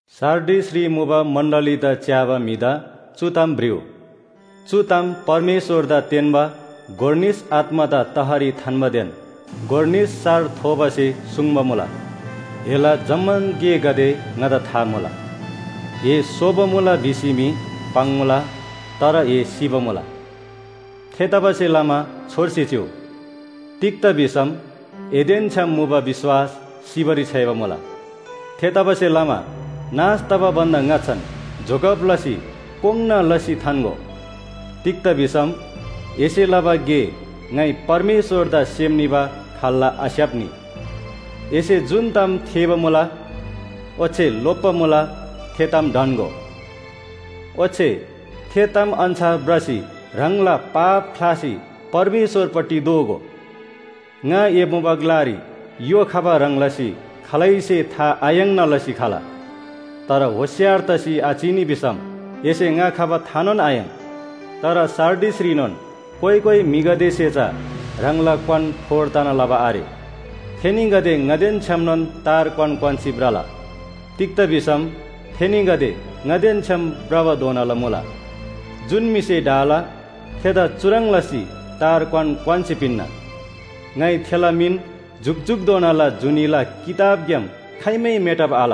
सार्डिसरी मुबा मण्‍डलीदा च्‍याबा म्‍हिदा चु ताम भ्रिउ। चु ताम परमेश्‍वरदा तेन्‍बा गोर निस आत्‍मादा तहरी थान्‍बादेन गोर निस सार थोबासे सुङ्बा मुला। एला जम्‍मान गेगदे ङादा था मुला, ए सोबा मुला भिसी मी पाङ्‌मुला, तर ए सिबा मुला। थेतबासेलमा छोर्सी चिउ, तिग्‍दा भिसम एदेन छ्‌याम मुबा विश्‍वास सिबारी छ्‌याइबा मुला। थेतबासेलमा नाश तबा भन्‍दा ङाच्‍छान जोगब लसी कोङ्‌ना लसी थान्‍गो। तिग्‍दा भिसम एसे लबा गे ङाइ परमेश्‍वरदा सेम निबा खाल्‍ला आस्‍याप्‍नी। एसे जुन ताम थेःबा मुला ओच्‍छे लोप्‍बा मुला, थे ताम ढन्‍गो। ओच्‍छे थे ताम अन्‍छार भ्रसी ह्राङला पाप ख्‍लासी परमेश्‍वरपट्टि दोःगो। ङा ए मुबा ग्‍लारी य्‍हो खबा ह्रङ् लसी खालैसे था आयाङ्ना लसी खला। तर होशियार तसी आचिनी भिसम एसे ङा खबा थानोन आयाङ्। तर सार्डिसरीनोन कोइ कोइ म्‍हिगदेसे चा ह्राङला क्‍वान फोहोर तना लबा आरे। थेनीगदे ङादेन छ्‌यामनोन तार क्‍वान क्‍वान्‍सी भ्रला। तिग्‍दा भिसम थेनीगदे ङादेन छ्‌याम भ्रबाधोनाला मुला। जुन म्‍हिसे ढाला थेदा चुह्रङ् लसी तार क्‍वान क्‍वान्‍सी पिन्‍ना। ङाइ थेला मिन जुकजुकधोनाला जुनीला किताबग्‍याम खाइमै मेटब आल।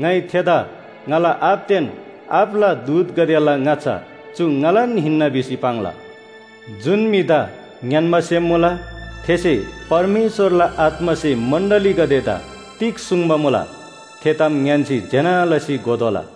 ङाइ थेदा ङाला आबादेन आबाला दूतगदेला ङाच्‍छा चु ङालान हिन्‍ना भिसी पाङ्ला। जुन म्‍हिदा ङ्‌यान्‍बा सेम मुला, थेसे परमेश्‍वरला आत्‍मासे मण्‍डलीगदेदा तिग सुङ्बा मुला, थे ताम ङ्‌यान्‍सी ज्‍यना लसी घोतोःला।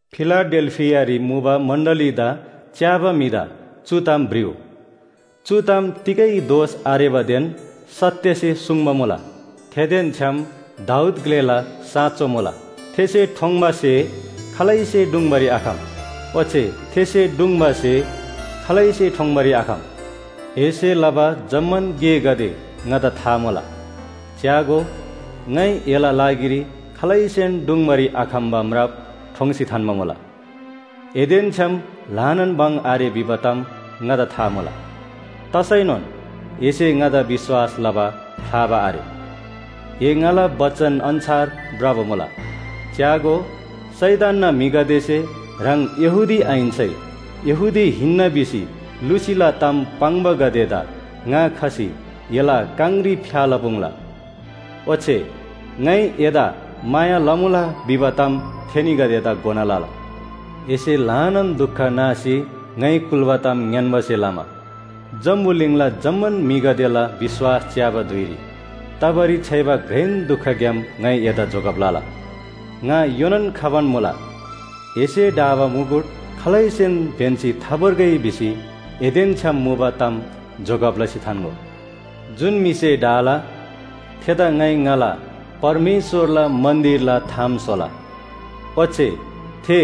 फिलाडेल्‍फियारी मुबा मण्‍डलीदा च्‍याबा म्‍हिदा चु ताम भ्रिउ। चु ताम तिगै दोष आरेबादेन सत्‍यसे सुङ्बा मुला। थेदेन छ्‌याम दाऊद ग्‍लेला साँचो मुला, थेसे ठोङ्‌बा स्‍हे खालैसे ढुङ्‌बारी आखम। ओच्‍छे थेसे ढुङ्‌बा स्‍हे खालैसे ठोङ्‌बारी आखम। एसे लबा जम्‍मान गेगदे ङादा था मुला। च्‍यागो, ङाइ एला लागिरी खालैसेन ढुङ्‌बारी आखम्‍बा म्राप ठोङ्सी थान्‍बा मुला। एदेन छ्‍याम ल्‍हानान भङ आरे भिबा ताम ङादा था मुला। तसैनोन एसे ङादा विश्‍वास लबा ख्‍लाबा आरे, ए ङाला बचन अन्‍छार भ्रबा मुला। च्‍यागो, शैतानना म्‍हिगदेसे ह्राङ यहूदी आहिन्‍सै यहूदी हिन्‍ना भिसी लुसीला ताम पाङ्‌बागदेदा ङा खसी एला काङरी फ्‍या लपुङ्ला। ओच्‍छे ङाइ एदा माया लमुला भिबा ताम थेनीगदेदा घोना लला। एसे ल्‍हानान दुख नासी ङाइ कुल्‍बा ताम ङ्‌यान्‍बासे लमा जम्‍बुलिङला जम्‍मान म्‍हिगदेला विश्‍वास च्‍याबा धुइरी तबारी छ्‌याइबा घ्रेन दुखग्‍याम ङाइ एदा जोगब लला। ङा योनान खबान मुला। एसे ढाबा मुकुट खालैसेन ब्‍यन्‍सी थाभोर्गै भिसी एदेन छ्‌याम मुबा ताम जोगब लसी थान्‍गो। जुन म्‍हिसे ढाला, थेदा ङाइ ङाला परमेश्‍वरला मन्‍दिरला थाम स्‍होला, ओच्‍छे थे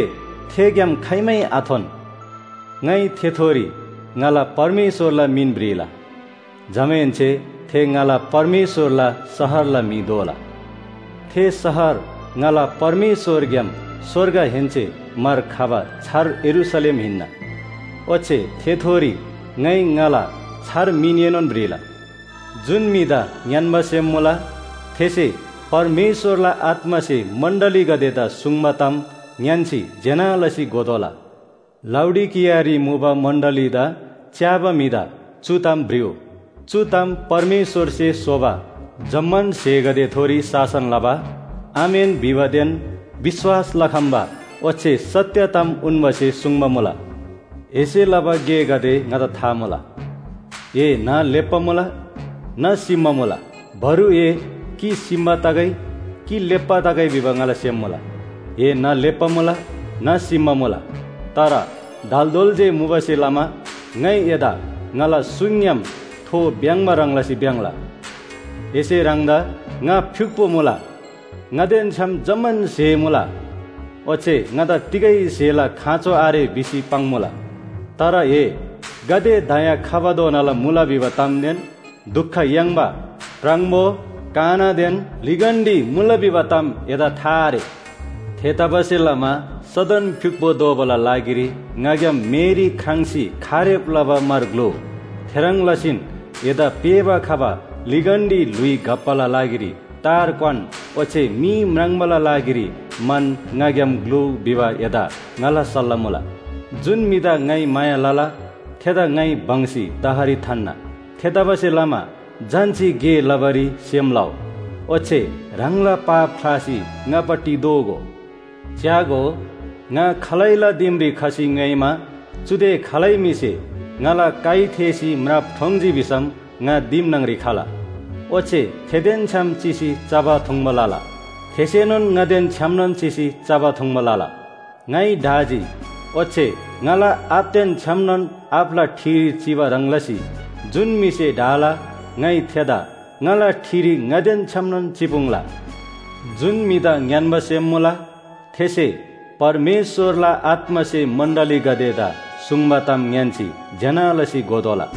थेग्‍याम खाइमै आथोन। ङाइ थेथोरी ङाला परमेश्‍वरला मिन भ्रिला, जमाहेन्‍से थे ङाला परमेश्‍वरला शहरला म्‍हि दोला। थे शहर ङाला परमेश्‍वरग्‍याम स्‍वर्गहेन्‍से मार खबा छार यरूशलेम हिन्‍ना। ओच्‍छे थेथोरी ङाइ ङाला छार मिनएनोन भ्रिला। जुन म्‍हिदा ङ्‌यान्‍बा सेम मुला थेसे परमेश्‍वरला आत्‍मासे मण्‍डलीगदेदा सुङ्बा ताम ङ्‌यान्‍सी ज्‍यना लसी घोतोःला। लाउडिकियारी मुबा मण्‍डलीदा च्‍याबा म्‍हिदा चु ताम भ्रिउ। चु ताम परमेश्‍वरसे स्‍होबा जम्‍मान स्‍हेगदेथोरी शासन लबा, आमेन भिबादेन विश्‍वास लखम्‍बा ओच्‍छे सत्‍य ताम उन्‍बासे सुङ्बा मुला। एसे लबा गेगदे ङादा था मुला। ए न्‍ह लेप्‍बा मुला, न्‍ह सिम्‍बा मुला। बरु ए कि सिम्‍बा तगै कि लेप्‍बा तगै भिबा ङाला सेम मुला। ए न्‍ह लेप्‍बा मुला न्‍ह सिम्‍बा मुला, तर दालदोल जे मुबासे लमा ङाइ एदा ङाला सुङग्‍याम थो भ्‍याङ्‍बा ह्रङ् लसी भ्‍याङ्‍ला। एसे ह्राङदा ङा फ्‍युक्‍पो मुला, ङादेन छ्‌याम जम्‍मान स्‍हे मुला ओच्‍छे ङादा तिगै स्‍हेला खाँचो आरे भिसी पाङ्‌मुला, तर ए गाते दया खबाधोनाला मुला भिबा तामदेन दुख याङ्बा, प्राङबो, कानादेन लिगन्‍डी मुला भिबा ताम एदा था आरे। थेतबासेलमा सदन फ्‍युक्‍पो दोबाला लागिरी ङाग्‍याम मेरी ख्राङ्‌सी खारेब लबा म्‍हर ग्‍लुउ। थेह्रङ् लसीन एदा पेःबा खबा लिगन्‍डी ल्‍हुइ घप्‍बाला लागिरी तार क्‍वान ओच्‍छे मी म्राङ्बाला लागिरी मन ङाग्‍याम ग्‍लुउ भिबा एदा ङाला सल्‍लाह मुला। जुन म्‍हिदा ङाइ माया लला, थेदा ङाइ बङ्‌सी तहरी थान्‍ना। थेतबासेलमा झन्‍सी गे लबारी सेम लउ, ओच्‍छे ह्राङला पाप ख्‍लासी ङापट्टि दोःगो। च्‍यागो, ङा खालैला दिमरी खसी ङ्‌योइमा चुदे खालै म्‍हिसे ङाला काइ थेःसी म्राप ठोङ्‌जी भिसम ङा दिम न्‍हङरी खला। ओच्‍छे थेदेन छ्‌याम चिसी चबा थुङ्बा लला, थेसेनोन ङादेन छ्‌यामनोन चिसी चबा थुङ्बा लला। ङाइ ढाजी, ओच्‍छे ङाला आबादेन छ्‌यामनोन आबाला ठिरी चिबा ह्रङ् लसी जुन म्‍हिसे ढाला ङाइ थेदा ङाला ठिरी ङादेन छ्‌यामनोन चिपुङ्ला। जुन म्‍हिदा ङ्‌यान्‍बा सेम मुला, थेसे परमेश्‍वरला आत्‍मासे मण्‍डलीगदेदा सुङ्बा ताम ङ्‌यान्‍सी ज्‍यना लसी घोतोःला।